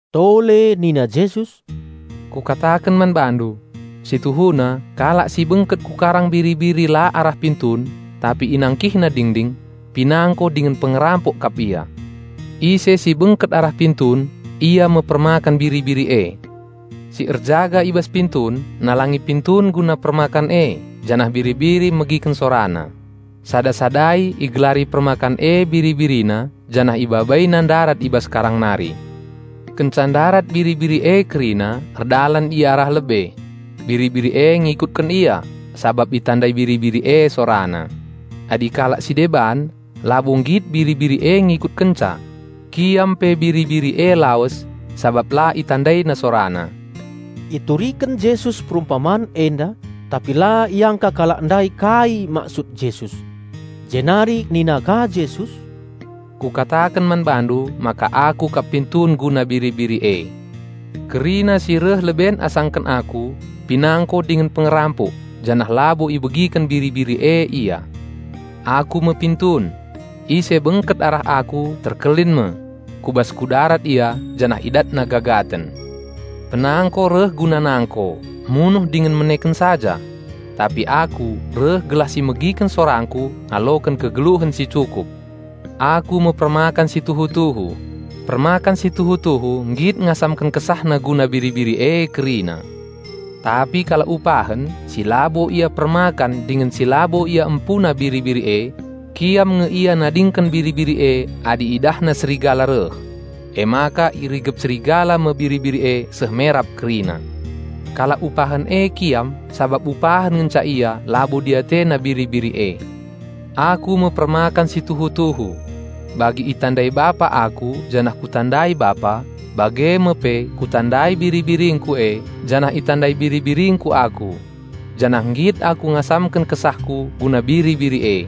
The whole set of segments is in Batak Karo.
Tole nina Jesus, "Kukataken man bandu: Si tuhuna kalak si bengket ku karang biri-biri la arah pintun, tapi inangkihna dingding, pinangko dingen pengerampok kap ia. Ise si bengket arah pintun, ia me permakan biri-biri e. Si erjaga i bas pintun nalangi pintun guna permakan e janah biri-biri megiken sorana. Sada-sadai igelari permakan e biri-birina janah ibabaina ndarat i bas karang nari. Kenca ndarat biri-biri e kerina, erdalan ia arah lebe. Biri-biri e ngikutken ia, sabap itandai biri-biri e sorana. Adi kalak si deban labo nggit biri-biri e ngikutkenca; kiam pe biri-biri e lawes sabap la itandaina sorana." Ituriken Jesus perumpaman enda, tapi la iangka kalak ndai kai maksud Jesus. Jenari nina ka Jesus, "Kukataken man bandu maka Aku kap pintun guna biri-biri e. Kerina si reh leben asangken Aku pinangko dingen pengerampok, janah labo ibegiken biri-biri e ia. Aku me pintun. Ise bengket arah Aku terkelin me. Ku bas-kudarat ia, janah idatna gagaten. Penangko reh guna nangko, munuh dingen meneken saja. Tapi Aku reh gelah si megiken sorangKu ngaloken kegeluhen si cukup. Aku me permakan si tuhu-tuhu. Permakan si tuhu-tuhu nggit ngasamken KesahNa guna biri-biri e kerina. Tapi kalak upahen, si labo ia permakan dingen si labo ia empuna biri-biri e, kiam nge ia nadingken biri-biri e adi idahna serigala reh. Emaka irigep serigala me biri-biri e seh merap kerina. Kalak upahen e kiam sabap upahen ngenca ia labo diatena biri-biri e. Aku me permakan si tuhu-tuhu. Bagi itandai Bapa Aku janah Kutandai Bapa, bage me pe Kutandai biri-biringKu e janah itandai biri-biringKu Aku. Janah nggit Aku ngasamken kesahKu guna biri-biri e.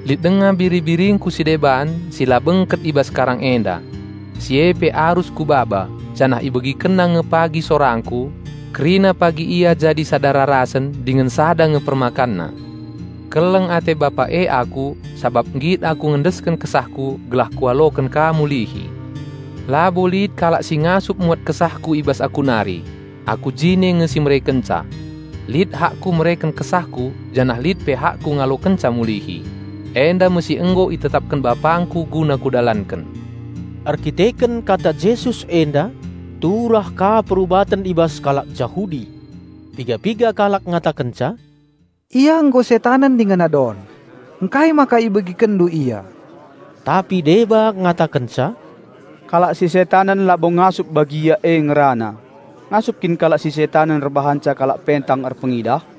Lit denga biri-biringKu si deban si la bengket i bas karang enda. Si e pe arus Kubaba, janah ibegikenna nge pagi sorangKu. Kerina pagi ia jadi sada rarasen dingen sada nge permakanna. Keleng ate Bapa e Aku sabap nggit Aku ngendesken kesahKu, gelah Kualoken ka mulihi. Labo lit kalak si ngasup muat kesahKu i bas Aku nari. Aku jine nge si merekenca. Lit hakKu mereken kesahKu janah lit pe hakKu ngalokenca mulihi. Enda me si nggo itetapken BapangKu guna Kudalanken." Erdandanken kata Jesus enda, turah ka perubaten i bas kalak Jahudi. Piga-piga kalak ngatakenca, "Ia nggo setanen dingen adon! Ngkai maka ibegikenndu Ia?" Tapi deba ngatakenca, "Kalak si setanen labo ngasup bagi Ia e ngerana! Ngasup kin kalak si setanen erbahanca kalak pentang erpengidah?"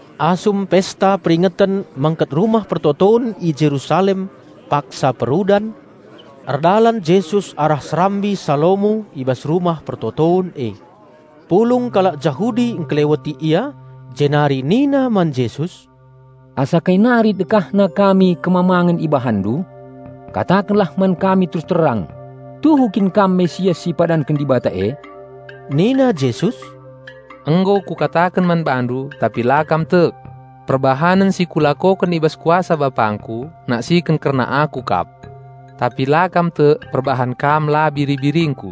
Asum pesta peringeten mengket Rumah Pertoton i Jerusalem, paksa perudan, erdalan Jesus arah serambi Salomo i bas Rumah Pertoton e. Pulung kalak Jahudi engkeleweti Ia, jenari nina man Jesus, "Asakai nari dekahna kami kemamangen IbahanNdu? Katakenlah man kami terus terang; tuhu kin Kam Raja Penampat si ipadanken Dibata e?" Nina Jesus, "Nggo Kukataken man bandu tapi la kam tek. Perbahanen si Kulakoken i bas kuasa BapangKu, naksiken kerna Aku kap. Tapi la kam tek perbahan kam la biri-biringKu.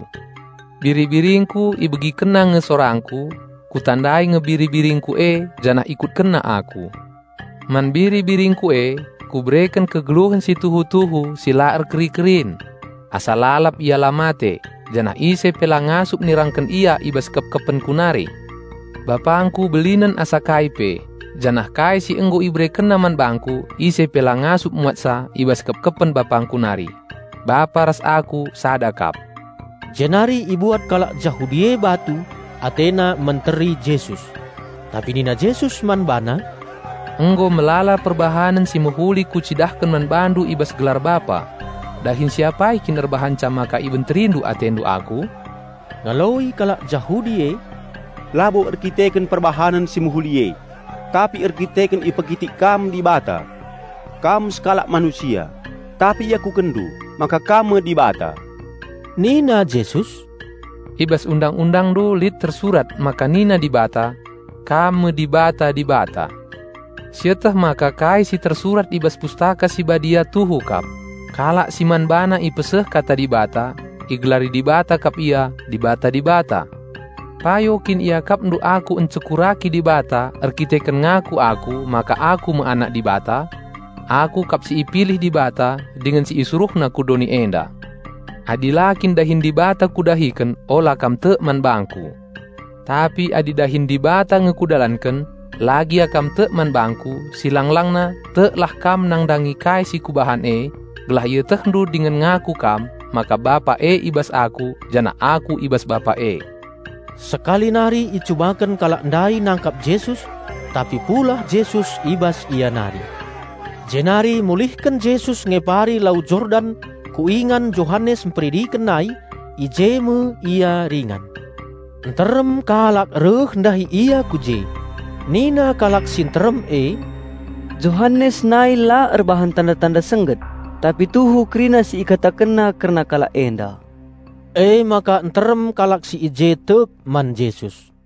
Biri-biringKu ibegikenna nge sorangKu. Kutandai nge biri-biringKu e janah ikutkenna Aku. Man biri-biringKu e Kubereken kegeluhen si tuhu-tuhu si la erkeri-kerin. Asa lalap ia la mate, janah ise pe la ngasup nirangken ia i bas kepkepenKu nari. BapangKu belinen asa kai pe, janah kai si nggo IberekenNa man bangKu ise pe la ngasup muatsa i bas kepkepen BapangKu nari. Bapa ras Aku sada kap." Jenari ibuat kalak Jahudi e batu, atena menteri Jesus. Tapi nina Jesus man bana, "Nggo melala perbahanen si mehuli Kucidahken man bandu i bas gelar Bapa. Dahin si apai kin erbahanca maka ibenterindu atendu Aku?" Ngaloi kalak Jahudi e, "Labo erdandanken perbahanen si mehuli e, tapi erdandanken ipekitik Kam Dibata! Kam sekalak manusia, tapi IakukenNdu maka Kam me Dibata." Nina Jesus, "I bas Undang-undangndu lit tersurat maka nina Dibata, 'Kam me dibata-dibata.' Sieteh maka kai si tersurat i bas Pustaka Si Badia tuhu kap. Kalak si man bana ipeseh kata Dibata, igelari Dibata kap ia: dibata-dibata. Payo kin iakapndu Aku encekuraki Dibata erdandanken ngaku Aku maka Aku me Anak Dibata? Aku kap si ipilih Dibata dingen si IsuruhNa ku doni enda. Adi la kin dahin Dibata Kudahiken ola kam tek man bangKu. Tapi adi dahin Dibata nge Kudalanken, la gia kam tek man bangKu, si lang-langna teklah kam nandangi kai si Kubahan e gelah ietehndu dingen ngaku kam maka Bapa e i bas Aku janah Aku i bas Bapa e." Sekali nari icubaken kalak ndai nangkap Jesus, tapi pulah Jesus i bas ia nari. Jenari mulihken Jesus ngepari Lau Jordan ku ingan Johanes mperidiken nai; i je me Ia ringan. Nterem kalak reh ndahi Ia ku je. Nina kalak si nterem e, "Johanes nai la erbahan tanda-tanda sengget, tapi tuhu kerina si ikatakenna kerna kalak enda." Emaka nterem kalak si i je tek man Jesus.